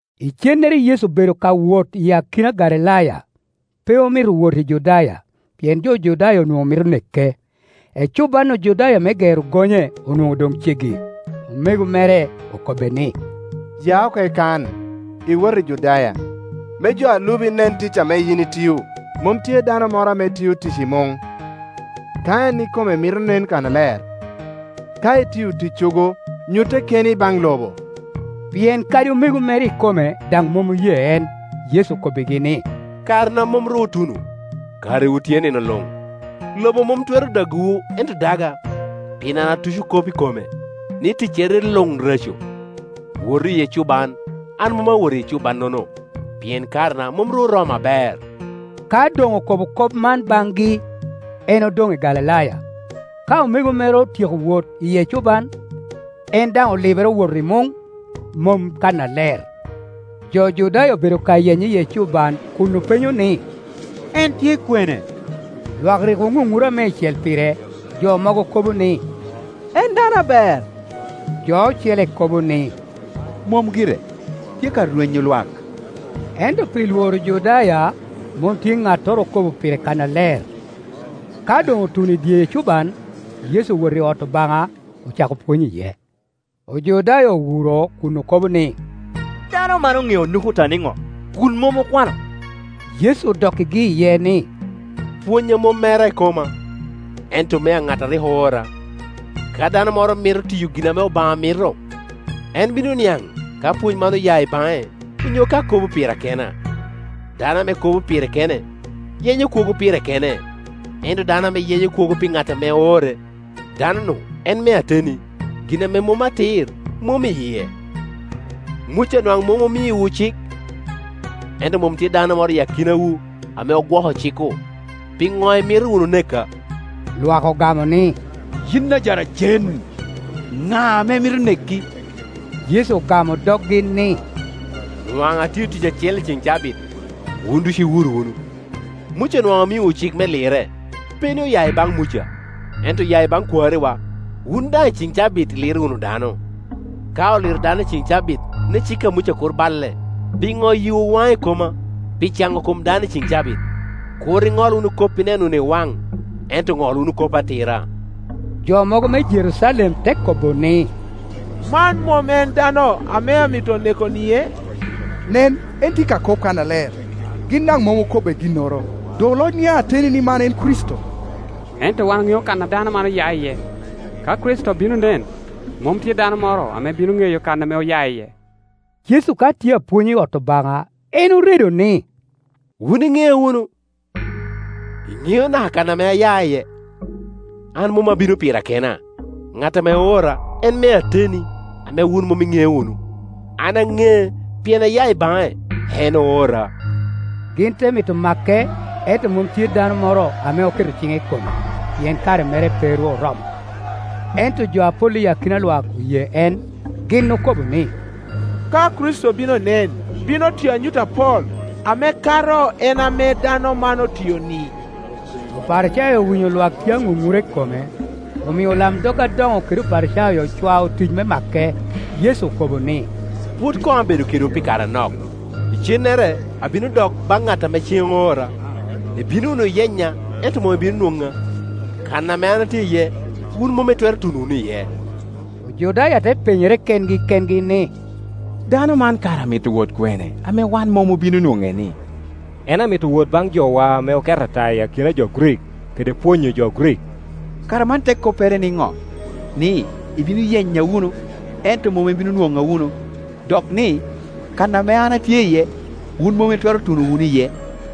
Icennere Yecu obedo ka wot i akina Galilaya; pe omito wot i Judaya, pien jo Judaya onwoŋo mito neke. Ecuban Ojudaya me Gero Gonye onwoŋo doŋ ceggi. Omego mere okobbe ni, “Ya oko i kano iwot i Judaya, me jo a lubi nen tic ame yin itio. Mom tye dano moro ame tio tic i muŋ, ka en ikome mito nen kannaler. Ka itio ticcogo, nyutte keni baŋ lobo.” Pien kadi omego mere ikome daŋ mom oye en Yecu okobbigi ni, “Karena mom ru otuno, karewu tye nino luŋ. Lobo mom twero dagowu, ento daga, pien an atuco kop i kome, ni tiecere luŋ reco. Wotu i ecuban; an mom awot i ecuban-nono, pien karena mom ru oromo aber.” Ka doŋ okobo kop man baŋgi, en odoŋ i Galilaya. Ka omego mere otyeko wot i ecuban, en daŋ olibere owoto i muŋ, mom kannaler. Jo Judaya obedo ka yenye i ecuban kun openyo ni, “En tye kwene?” Lwak rik oŋuŋura meicel pire. Jo mogo kobo ni, “En dano aber”; jo ocele ko bo ni, “Mom gire, tye ka rwenyo lwak.” Ento pi lworo Ojudaya, mom tye ŋattoro okobo pire kannaler. Ka doŋ otuno i dye ecuban, Yecu owoto i ot Obaŋa, ocako pwony iye. Ojudaya owuro kun okobo ni, “Dano man oŋeo nukuta niŋo, kun mom okwano?” Yecu odokkigi iye ni, “Pwonnya mom mera ikoma, ento mea ŋat ame rik oora. Ka dano moro mito tiyo gin ame Obaŋa mito, en bino niaŋ ka pwony man oya i baŋe, onyo ka akobo pira kena. Dano ame kobo pire kene, yenyo kwogo pire kene; ento dano ame yenyo kwogo pi ŋat ame oore, dano-nu en me ateni, gin ame mom atir mom i yie. Muca nwaŋ mom omiowu cik? Ento mom tye dano moro i akinawu ame gwoko cik-ku. Piŋo imito nuwu neka?” Lwak ogamo ni, “Yin ajaracen! Ŋa ame mito neki?” Yecu ogamo doggi ni, “Nwaŋ atio tic acel i cen cabit, wun ducu iwuro wunu. Muca nwaŋ omiowu cik me lirre (pe ni oya i baŋ Muca, ento oya i baŋ kwariwa), wun daŋ icen cabit iliro wunu dano. Ka oliro dano i cen cabit, ni cik a Muca kur baile, pino yiwu wan i koma pi cano kom dano i cen cabit? Kur iŋol wunu kop ineno wunu i waŋ, ento ŋol wunu kop atira.” “Man en Kricito” Jo mogo me Jerucalem te kobo ni, “Man mom en dano ame amito neko-nie? Nen, en tye ka kop kannaler, gin daŋ mom okobbe ginnoro. Doŋ oloc niaŋ ateni ni man en Kricito? Ento wan oŋeo kan a dano man oya iye; ka Kricito bino nen, mom tye dano moro ame bino ŋeyo kan ame oya iye.” Yecu ka tye apwony i ot Obaŋa, en oredo ni, “Wun iŋea wunu, iŋeo naka kan ame aya iye? An mom abino pira kena; ŋat ame oora en me ateni, ame wun mom iŋeo wunu. An aŋee, pien aya i baŋe, en oora.” Gin te mito make, ento mom tye dano moro ame oketo ciŋe i kome, pien kare mere pe ru oromo. Ento jo apol i akina lwak oye en. Gin okobo ni, “Ka Kricito bino nen, bino tiyo anyut apol ame kato en ame dano man otio-ni?” Oparicayo owinyo lwak tye aŋunura i kome, omio olamdog adoŋo kede Oparicayo ocwao otic me make. Yecu okobo ni, “Pwod koŋ abedo kedwu pi kare anok, icennere abino dok baŋ ŋat ame cen oora. Ibino wunu yenya, ento mom ibino nwoŋa; kan ame an atye iye, wun mom itwero tuno wunu iye.” Ojudaya te penyere kengi kengi ni, “Dano man kara amito wot kwene, ame wan mom obino nwoŋe-ni? En amito wot baŋ jowa ame oket ata i akina jo Grik kede pwonyo jo Grik? Kara man te koppere niŋo, ni, ‘Ibino yenya wunu, ento mom ibino nwoŋa wunu,’ dok ni, ‘Kan ame an atye iye, wun mom itwero tuno wunu iye?’”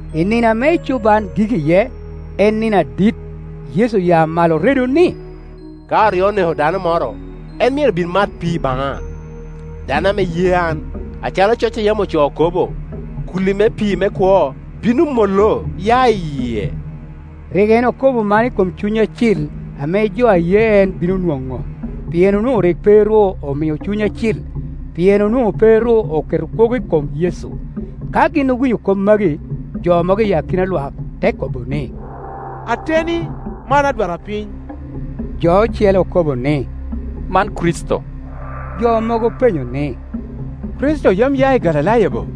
I nino ame ecuban gik iye, en nino adit, Yecu oya malo oredo ni, “Ka oryo neko dano moro, en myero bin mat pii baŋa. Dano ame ye an, acalo coc a yam ocoo kobo, ‘Kulli me pii me kwo bino mollo ya i yie.’” Rik en okobo man i kom Cuny Acil ame jo a ye en bino nwoŋo; pien onwoŋo rik pe ru omio Cuny Acil, pien onwoŋo pe ru oketo kwogo i kom Yecu. Ka gin owinyo kop magi, jo mogo i akina lwak te kobo ni, “Ateni, man adwarpiny.” Jo ocele okobo ni, “Man Kricito.” Jo mogo openyo ni, “Kricito yam ya i Galilaya bo?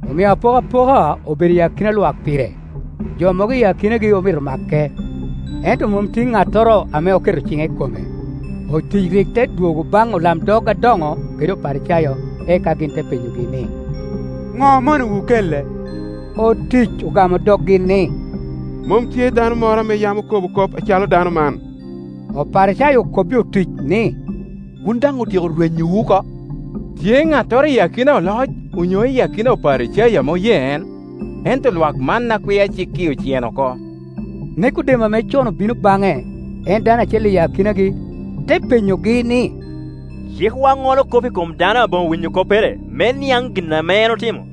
Omio apokapoka obedo i akina lwak pire. Jo mogo i akinagi omito make, ento mom tye ŋattoro ame oketo ciŋe i kome. Otic rik te dwogo baŋ olamdog adoŋo kede Oparicayo, eka gin te penyogi ni, “ŋo omonowu kele?” Otic ogamo doggi ni, “Mom tye dano moro ame yam okobo kop acalo dano man.” Oparicayo okobbi otic ni, “Wun daŋ otyeko rwenyowu oko?” Tye ŋattoro i akina oloc onyo i akina Oparicayo ame oye en? Ento lwak man a kwia cik-ki oceno oko. Nekodem, ame con obino baŋe, en dano acel i akinagi, te penyogi ni, “Cikwa ŋolo kop i kom dano aboŋo winyo koppere, me niaŋ gin ame en otimo?”